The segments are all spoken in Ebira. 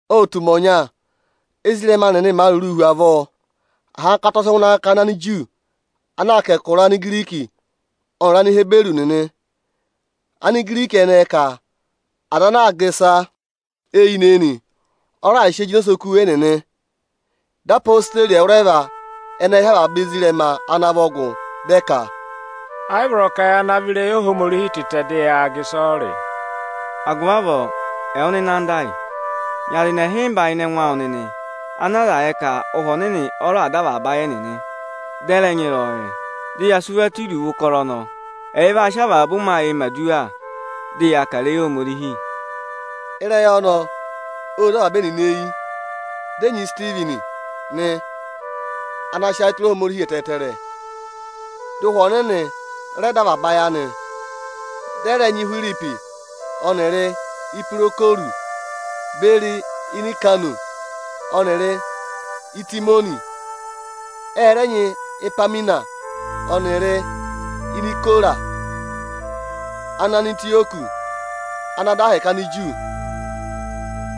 Ô tù ụmẹ ọnya, ézirẹma nịnị màa rụrụụ hu avọọ, ahankata ọ sị ngụ ịnị akakana Aniju ana aa kà ẹkụra Anigiriki ọnịrị Anihiburu nịnị. Anigiriki ẹnẹẹ ka ọza ana aa gà ịsa eyinị-eyinị, ọ raà sị eyi jịnẹ osoku ẹnịnị. Dị odeyi ẹwụrẹva ẹnẹẹ hị́ avaba ezirẹma ana vọ gụ, dị ẹ ka, “Ẹ yị vọrọ ka ya navọ ịrẹyị Ohomorihi tịtẹ, dị yaa gà ịsọyịrị. Agụvị avọọ, ẹwụ nịnị anda ayị, nyị aza ẹnị ịhịmba ịnị ẹngụ awụ nịnị ana aza yẹ ka Ụhwẹ Ọnịnị ọ raà dọ avaba ayị ẹnịnị, dị ẹ rẹ nyị ịrẹyọyẹ. Dị ya sị wa tụ́ iruvo ụkọrọ ọnọọ. Ẹyị vaa sị avaba ụmẹ ayịị mẹ̀ aduwa, dị yaa kà ịrẹyị Ohomorihi.” Ịrẹyị ọnọọ ô zé avaba ẹnịnị eyi. Dị ẹ nyị Isitivini nị, ana sị ayị tụra Ohomorihi ẹtẹẹtẹrẹ, dị Ụhwẹ Ọnịnị rẹ dọ avaba ayị anị. Dị ẹ rẹ nyị Ihwiripi ọnịrị Ipirokorusi beri Inikanọ ọnịrị Itimoni nị. Ẹ rẹ nyị Ipaminasi ọnịrị Inikorasi Anantịyọkị ana dọ ahẹkẹ Aniju.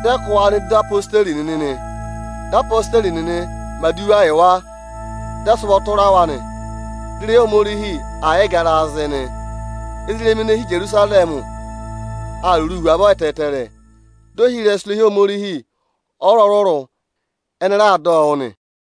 Dị ẹ kụ́ wa nọ ịdị odeyi nịnị nị. Dị odeyi nịnị mẹ̀ aduwa yị wa, dị ẹ sị ụvọ tụra wa nị. Dị ịrẹyị Ohomorihi aa yịị garaa zị nị. Ezirẹma ene hi Ijerusarẹmị aa rụrụụ hu avọọ ẹtẹẹtẹrẹ; di ohirẹsụ irehi Ohomorihi ọrụrụ-ọrụrụ ẹnị raa dọ ọ wụ́ nị.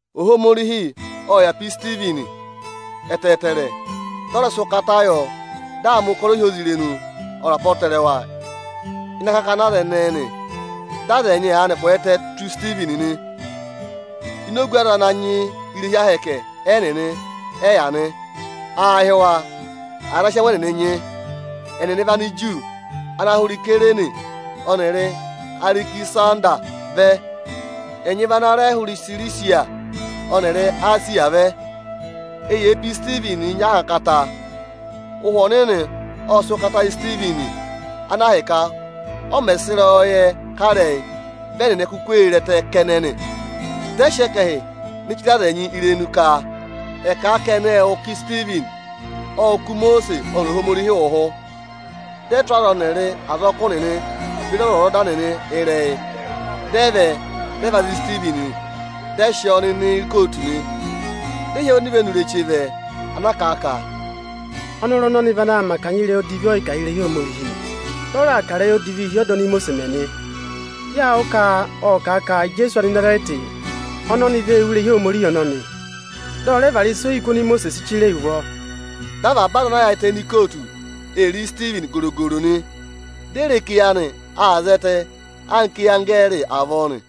Ohomorihi ộ yà pe Isitivini ẹtẹẹtẹrẹ, dị ọ rẹ sị ụkata yọ, dị aa mẹ̀ ụkọrọ ohyozirenu ọnịrị apọtẹrẹwa ịnị akakana aza ẹnẹẹ nị. Dị aza ẹnyị aanị kwẹẹtẹ tù Isitivini nị. Ini ogu aza ana nyị irehi Ohomorihi ẹnịnị ẹ yà nị. Aā hị́ wa “Aza ana sị ẹngụ ẹnịnị nyị.” Ẹnịnị vị Aniju ana hụrẹ Isayirini ọnịrị Arẹkịsanda vẹ. Ẹnyị vị ana rẹ hụrẹ Isirisiya ọnịrị Esiya vẹ. Eyee pe Isitivinii nyị ahankata. Ụhwẹ Ọnịnị ộ sị ụkata yị Isitivini, ana ahịka ọ mẹ̀ sị ịrẹyọyẹ kà ịrẹyị, vị ẹnịnị kuku ee re ẹtẹ kẹnẹ nị. Dị ẹ sị ẹkẹhị ne chire aza ẹnyị irenu ka ẹ̀ kà a ka ẹnị ệ wụ́ ka Isitivini ộ kụ̀ Imosiisi ọnịrị Ohomorihi ụhụ. Dị ẹ tụ́ aza ọnịrị azọkụ nịnị beri ọzwọzọda nịnị ịrẹyị, dị ẹ vẹ, dị ẹ va za Isitivini, dị ẹ sị ọọ nọ ini ikootu nị. Dị ẹ hị́ onivenu ireche vẹ, ana kà a ka, “Ọnọrụ ọnọnị vị ana aa mẹ akanya ịrẹyị odivi ọyịkà a hi irehi Ohomorihi, dị ọ raa kà ịrẹyị odivii hi ọda oni Imosiisi mẹ nị. Yâ wụ́ ka ộ kà a ka Ijeesu Anịnazarẹtị ọnọnị vee wú irehi Ohomorihi ọnọnị, dị ọ rẹ vara ịsa ohiku oni Imosiisi si chire yi ụvọ.” Dị avaba aza ana yaayịtẹ ini ikootu ee re Isitivini goro-goro nị. Di e re ka eyi anị aa zẹtẹ anka eyi anggẹẹrị avọọ nị.